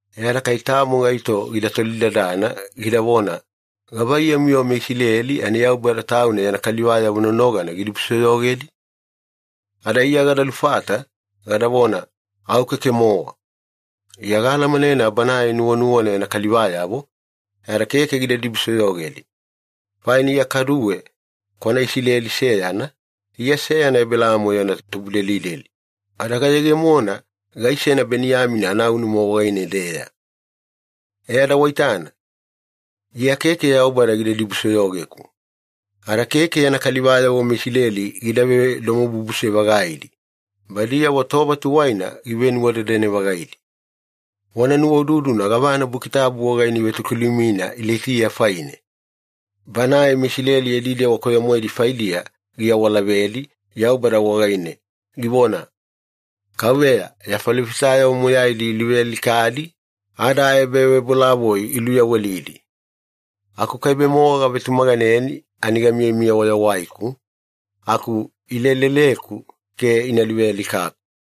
E ada kai tamo gaito gida tolidadana, gidavona, “Gavaiyamu-yo meIsileli ani Yaubada Tauna yana kalivayavo nonogana gidibusoyogedi?” Ada Iya gada lufata, gadavona, “Au, keke-mowa!” Iya gaalamanena Banae nuwanuwana yana kalivayavo, ada keke gida dibusoyogedi. Faina Iya kaduwe kwana Isileli seyana, Iya seyana Ebelaamo yana tubudelideli, ada gayegemona gaisena Beniyamina anaunuma wagaine-deya. E ada waitana, Iya keke Yaubada gida dibusoyogeku. Ada keke yana kalivayavo meIsileli gida vedomobubuse-vagaidi, badiyavo tova tuwaina givenuwadadane-vagaidi. Wana nuwaududuna gavana Buki Tabu wagaine ivetokilumina Ilaitiya faine. Banae MeIsileli yadi dewa koyo-moedi faidiya giawalavedi Yaubada wagaine, givona, “KAUVEYA, ya falofitayavo moyaidi iluvealikadi, ada aebavebolavoi iluyawelidi. Akukaibe-mowa gavetumaganeni ani gamiyamiya wayawaiku, aku ileleleku ke ina luvealikaku.”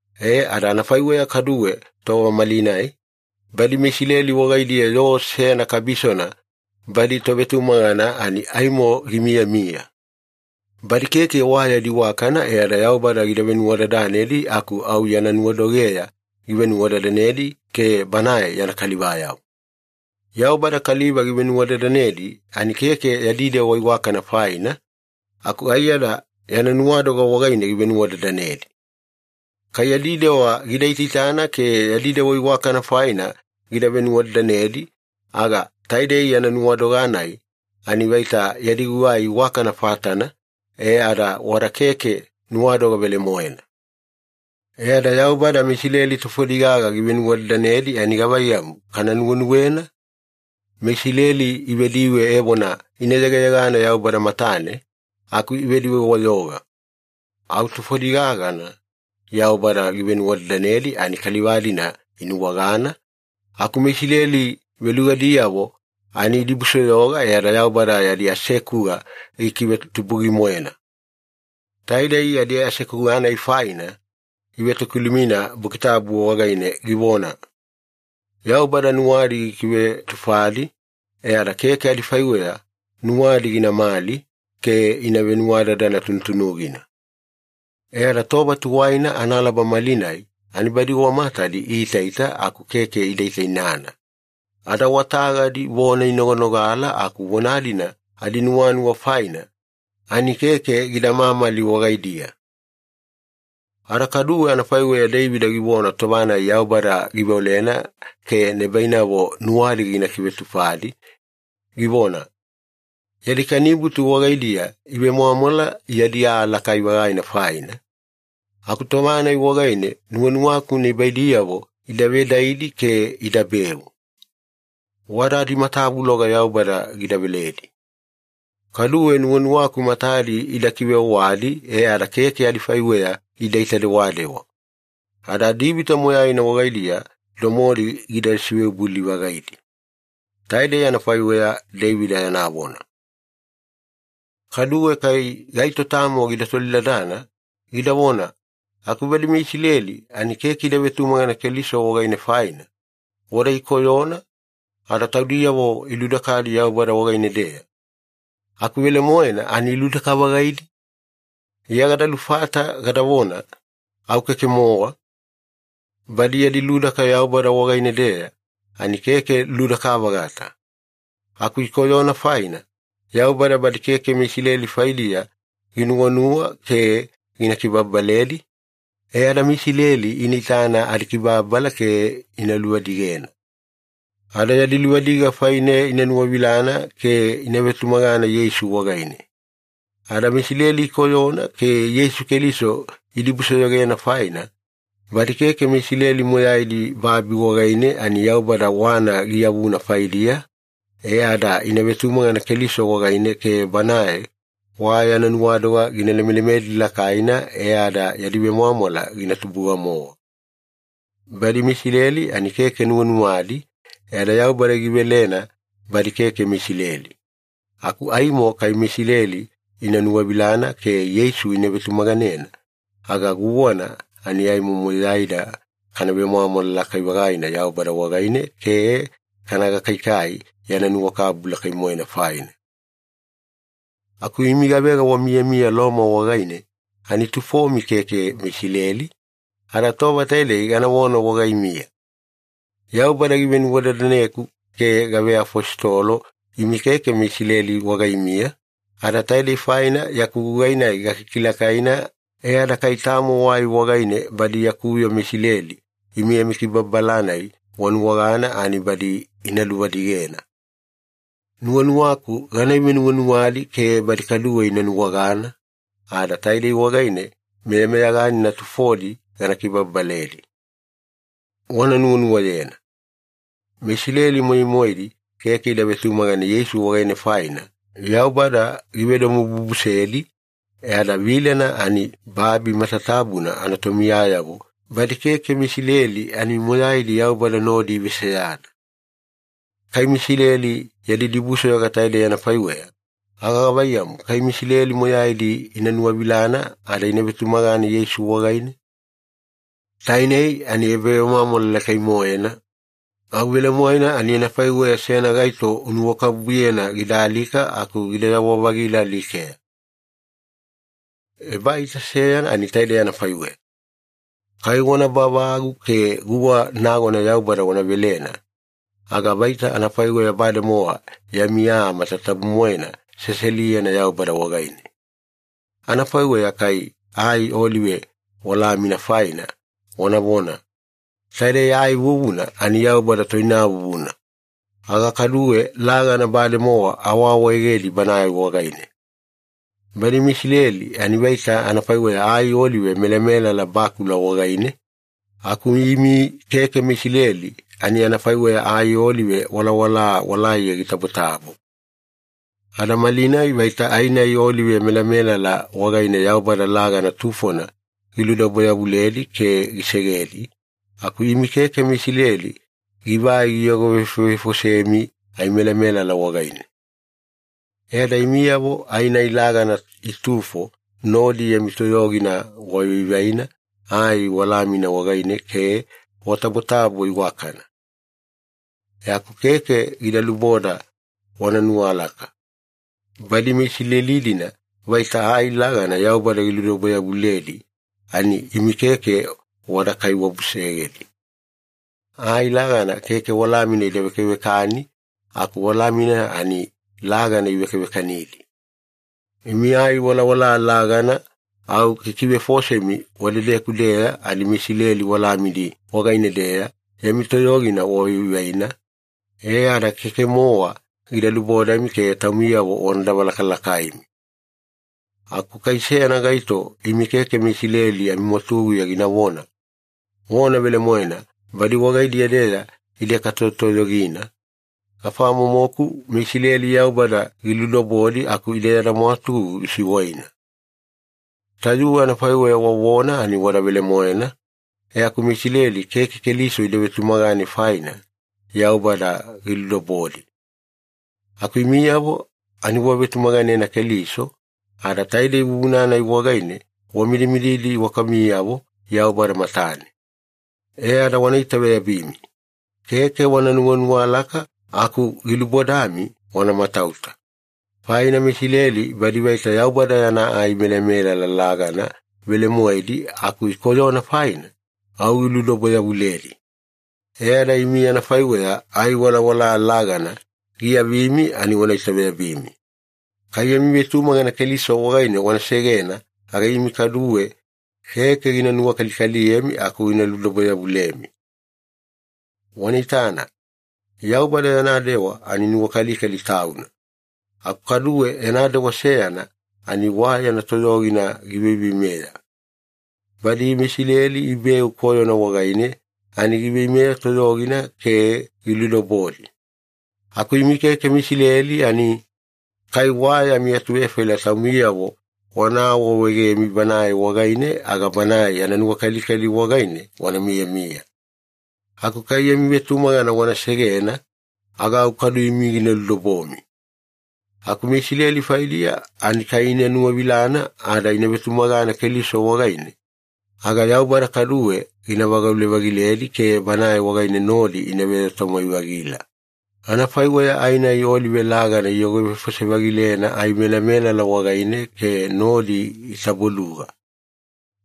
E ada anafaiweya kaduwe tova malinai, badi meIsileli wagaidiya yoo seyana kabisona badi tovetumagana ani aimo gimiyamiya. Badi keke wa yadi iwakana e ada Yaubada gida venuwadadanedi aku au yana nuwadogeya givenuwadadanedi ke Banae yana kalivayavo. Yaubada kaliva givevenuwadadanedi ani keke yadi dewa iwakana faina, aku aiyada yana nuwadoga wagaine givevenuwadadanedi. Kai yadi dewa gida itaitana ke yadi dewa iwakana faina gida venuwadadanedi, aga taidei yana nuwadoga-nai ani vaita yadi gugai iwakana fatana, e ada wada keke nuwadoga velemoena. E ada Yaubada meIsileli tufodi gaga givenuwadadanedi ani gavaiyamu kana nuwenuwena? MeIsileli ivediwe evona ina yegayegana Yaubada matane, aku ivediwe-wayoga. Au tufodi gagana Yaubada givenuwadadanedi ani kaliva-dina inuwagana, aku meIsileli velugadiyavo ani idibusoyoga e ada Yaubada yadi asekuga gikivetubugi-moena. Taidei yadi asekuga-nai faina ivetokilumina Buki Tabu wagaine, givona, “Yaubada nuwadi gikivetufadi e ada keke adifaiweya nuwadi ginamali ke ina venuwadadana tunutunugina. E ada tova tuwaina analaba malinai ani badi wa matadi iitaita aku keke ida itaitainana, ada wa tagadi vona inoganogala aku vona-dina adinuwanuwa faina ani keke gida mamali wagaidiya.” Ada kaduwe anafaiweya Deivida givona tova-nai Yaubada giveolena ke nibainavo nuwadi gina kivetufadi, givona, “Yadi kanibutu wagaidiya ivemwamwala yadi aa lakai-vagaina faina, aku tova-nai wagaine nuwanuwaku nibaidiyavo ida vedaidi ke idabeu. Wada adimatavuloga Yaubada gida veledi. Kaduwe nuwanuwaku matadi ida kiveowadi e ada keke adifaiweya idaita-dewadewa, ada adivita moyaina wagaidiya domodi gida siveibouli-vagaidi.” Taidei anafaiweya Deivida yana vona. Kaduwe kai gaito tamo gida tolidadana, gidavona, “Aku badi meIsileli ani keke ida vetumagana Keliso wagaine faina, wada ikoyona, ada taudiyavo iludakadi Yaubada wagaine-deya. Aku velemoena ani iludaka-vagaidi?” Iya gada lufata gadavona, “Au keke-mowa! Badi yadi ludaka Yaubada wagaine-deya ani keke ludaka-vagata. Aku ikoyona faina, Yaubada badi keke meIsileli faidiya ginuwanuwa ke gina kibababaledi, e ada meIsileli ina itana adikibababala ke ina luvadigena. Ada yadi luvadiga faine ina nuwavilana ke ina vetumagana Yeisu wagaine. Ada meIsileli ikoyona ke Yeisu Keliso idibusoyogena faina, badi keke meIsileli moyaidi babi wagaine ani Yaubada wana giyavuna faidiya e ada ina vetumagana Keliso wagaine ke Banae wa yana nuwadoga gina lemelemedi lakaina, e ada yadi vemwamwala gina tubuga-mowa. Badi meIsileli ani keke nuwanuwadi, e ada Yaubada givelena badi keke meIsileli. Aku aimo kai meIsileli ina nuwavilana ke Yeisu ina vetumaganena, aga guwana ani moyaida kana vemwamwala lakai-vagaina Yaubada wagaine ke kana gakaikai yana nuwakabubu lakai-moena faina.” Aku imi gavega wamiyamiya Loma wagaine ani tufomi keke meIsileli, ada tova taidei ganavona wagaimiya. Yaubada givenuwadadaneku ke gaveafositolo imi keke meIsileli wagaimiya, ada taidei faina yaku gugai-nai gakikilakaina e ada kai tamo wai wagaine badi yaku yoo meIsileli imi amikibababala-nai wanuwagana ani badi ina luvadigena. Nuwanuwaku gana ivenuwanuwadi ke badi kaduwe ina nuwagana, ada taide wagaine meyameyaganina tufodi gana kibababaledi. Wana nuwanuwayena. MeIsileli moyai-moedi keke ida vetumagana Yeisu wagaine faina, Yaubada givedomobubusedi, e ada vilena ani babi matatabuna anatomiyayavo badi keke meIsileli ani moyaidi Yaubada nodi iveseyana. Kai meIsileli yadi dibusoyoga taidei anafaiweya, aga gavaiyamu kai meIsileli moyaidi ina nuwavilana ada ina vetumagana Yeisu wagaine? Tainei ani ebavemwamwala lakai-moena, au velemoena ani anafaiweya seyana gaito unuwakabubuyena gida alika aku gidayawa-vagila alikeya. Ebaita seyana ani taidei anafaiweya. Kai wana bavagu ke guwa nagona Yaubada wana velena, aga vaita anafaiweya bademowa yami aa matatabu-moena seseliyena Yaubada wagaine. Anafaiweya kai ai olive walamina faina wanavona, “Taidei ai vuvuna ani Yaubada toinavuvuna,” aga kaduwe lagana bademowa awaawaegedi Banae wagaine. Badi meIsileli ani vaita anafaiweya ai olive melamelala bakula wagaine, aku imi keke meIsileli ani anafaiweya ai olive walawala walaiya gitabotabo. Ada malinai vaita ai-nai olive melamelala wagaine Yaubada lagana tufona giludobo-yavuledi ke gisegedi, aku imi keke meIsileli givai giyogovefovefosemi ai melamelala wagaine. E ada imiyavo ai-nai lagana itufo nodi yami toyogina wavaivaina ai walamina wagaine ke watabotabo iwakana. E aku keke gida luboda wana nuwalaka. Badi meIsileli-dina vaita ai lagana Yaubada giludobo-yavuledi ani imi keke wada kaiwabusegedi. Ai lagana keke walamina ida vekavekani aku walamina ani lagana ivekavekanidi. Imi ai walawala lagana au kikivefosemi wadedeku-deya ani meIsileli walamidi wagaine-deya yami toyogina wavaivaina, e ada keke-mowa gida lubodami ke taumiyavo wana davalakalakaimi. Aku kai seyana gaito imi keke meIsileli amimwatuguya ginavona, “Vona velemoena badi wagaidiya-deya ide katoyotoyogina, afamomoku meIsileli Yaubada giludobodi aku ide yada mwatugu gisiwaina.” Tayuwe anafaiweya wavona ani wada velemoena, e aku meIsileli keke Keliso ida vetumagane faina, Yaubada giludobodi. Aku imiyavo ani wavetumaganena Keliso, ada taidei vuvuna-nai wagaine wamidimididi iwakamiyavo Yaubada matane. E ada wana itaveyabimi. Keke wana nuwanuwalaka aku gilubodami wana matauta. Faina meIsileli badi vaita Yaubada yana ai melamelala lagana velemoedi aku ikoyona faina, au giludobo-yavuledi. E ada imi anafaiweya ai walawala lagana giavimi ani wana itaveyabimi. Kai yami vetumagana Keliso wagaine wana segena, aga imi kaduwe keke gina nuwakalikaliyemi aku gina ludobo-yavulemi. Wana itana, Yaubada yana dewa ani nuwakalikali Tauna, aku kaduwe yana dewa seyana ani wa yana toyogina giveiveimeya. Badi meIsileli ibeu koyona wagaine ani giveimeya toyogina ke giludobodi. Aku imi keke meIsileli ani, kai wa yami atuvefaila taumiyavo wana awaawaegemi Banae wagaine aga Banae yana nuwakalikali wagaine wana miyamiya. Aku kai yami vetumagana wana segena, aga au kadu imi gina ludobomi. Aku meIsileli faidiya ani kai ina nuwavilana ada ina vetumagana Keliso wagaine, aga Yaubada kaduwe gina vagaule-vagiledi ke Banae wagaine nodi ina veyoo-tamwai-vagila, anafaiweya ai-nai olive lagana iyogovefose-vagilena ai melamelala wagaine ke nodi itaboluga.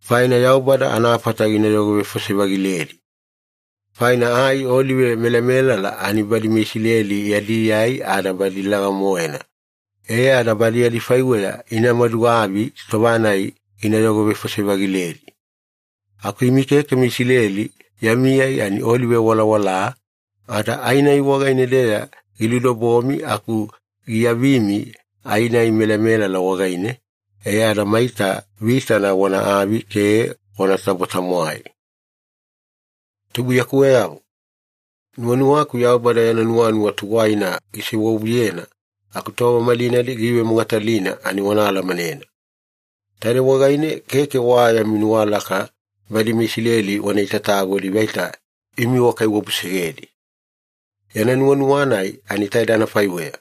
Faina Yaubada anafata gina yogovefose-vagiledi. Faina ai olive melamelala ani badi meIsileli yadi ai ada badi laga-moena, e ada badi adifaiweya ina maduavi tova-nai gina yogovefose-vagiledi. Aku imi keke meIsileli yami ai ani olive walawala, ada ai-nai wagaine-deya giludobomi aku giavimi ai-nai melamelala wagaine, e ada maita vitana wana avi ke wanatabo-tamwai. Tubuiyakuweyavo, nuwanuwaku Yaubada yana nuwanuwa tuwaina gisewavuyena aku tova malinai giivemogatalina ani wana alamanena. Taidei wagaine keke wa yami nuwalaka badi meIsileli wana itatagodi vaita imi wakaiwabusegedi. Yana nuwanuwa-nai ani taide anafaiweya.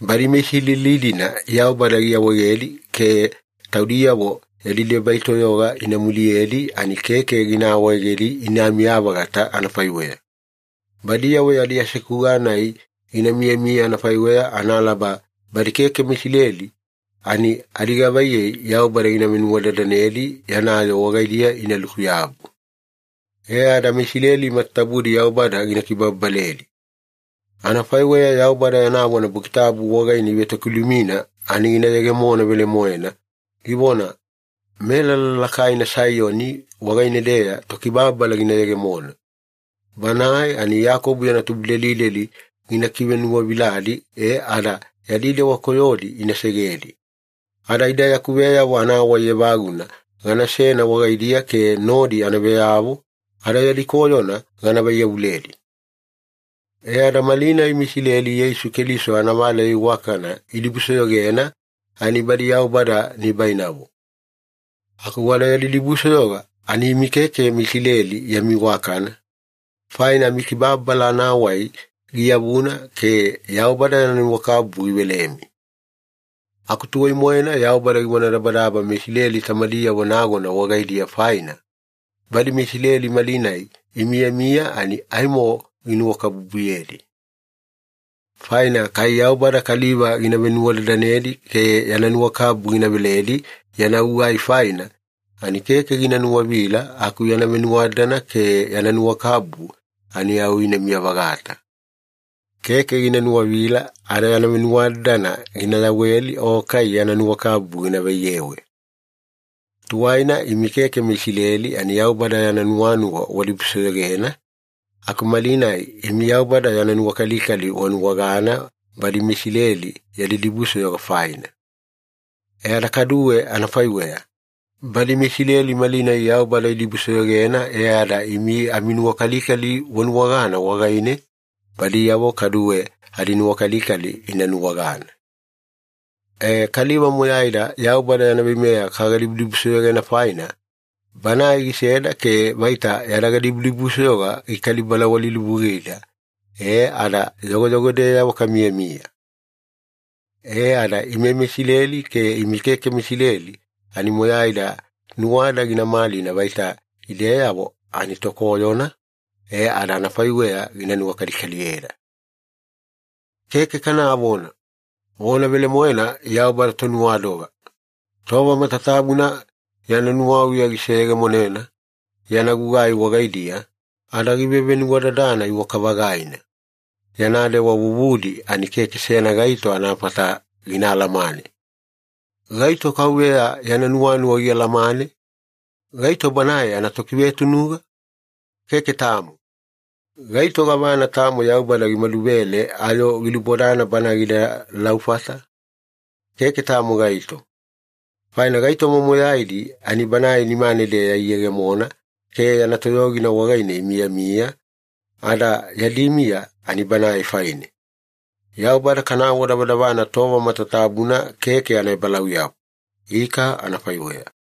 Badi meIsileli-dina Yaubada giawaegedi ke taudiyavo yadi debai toyoga ina muliyedi ani keke gina awaegedi inamiya-vagata anafaiweya. Badiyavo yadi asekuga-nai gina miyamiya anafaiweya analaba badi keke meIsileli ani adigavaiyei Yaubada givenuwadadanedi yana yoo wagaidiya inaluku-yabu. E ada meIsileli matatabudi Yaubada gina kibababaledi. Anafaiweya Yaubada yana vona Buki Tabu wagaine ivetokilumina ani gina yegemona velemoena, givona, “Melala lakaina Saiyoni wagaine-deya Tokibababala gina yegemona. Banae ani Iyakobo yana tubudelideli gina kivenuwaviladi e ada yadi dewa koyodi ina segedi. Ada ida yaku veyavo anawai evaguna ganasena wagaidiya ke nodi ana veyavo, ada yadi koyona gana vaiyavuledi.” E ada malinai meIsileli Yeisu Keliso anavaleya iwakana idibusoyogena ani badi Yaubada nibainavo. Aku wada yadi dibusoyoga ani imi keke meIsileli yami iwakana, faina amikibababala anawai giyavuna ke Yaubada yana nuwakabubu givelemi. Aku tuwai-moena Yaubada givonadabadaba meIsileli tamadiyavo nagona wagaidiya faina, badi meIsileli malinai imiyamiya ani aimo ginuwakabubuyedi. Faina kai Yaubada kaliva gina venuwadadanedi ke yana nuwakabubu gina veledi yana gugai faina, ani keke gina nuwavila aku yana venuwadadana ke yana nuwakabubu ani au inamiya-vagata. Keke gina nuwavila ada yana venuwadadana gina yaweli o kai yana nuwakabubu gina vaiyewe. Tuwaina imi keke meIsileli ani Yaubada yana nuwanuwa wadibusoyogena, aku malinai imi Yaubada yana nuwakalikali wanuwagana badi meIsileli yadi dibusoyoga faina. E ada kaduwe anafaiweya, badi meIsileli malinai Yaubada idibusoyogena e ada imi aminuwakalikali wanuwagana wagaine, badiyavo kaduwe adinuwakalikali ina nuwagana. E, kaliva moyaida Yaubada yana veimeya kagadibudibusoyogena faina, Banae giseda ke vaita yada gadibudibusoyoga gikali-balawalilivugida e ada yogoyogodeyavo kamiyamiya. E ada ime meIsileli ke imi keke meIsileli ani moyaida nuwada gina malina vaita ideyavo ani tokoyona, e ada anafaiweya gina nuwakalikaliyeda. Keke kanavona! Vona velemoena Yaubada Tonuwadoga! Tova matatabuna yana nuwauya giseyegemonena yana gugai wagaidiya, ada givevenuwadadana iwaka-vagaina! Yana dewa vuvudi ani keke seyana gaito anafata gina alamane. “Gaito KAUVEYA yana nuwanuwa gialamane? Gaito Banae anatokivetunuga? Keke tamo!” “Gaito gavana tamo Yaubada gimaduvele ayo gilubodana Bana gida laufata? Keke tamo gaito.” Faina gaitoma moyaidi ani Banae nimane-deya iyegemona ke yana toyogina wagaine imiyamiya, ada yadi miya ani Banae faine. Yaubada kana awadavadavana tova matatabuna keke anaebalauyabu. Ika anafaiweya.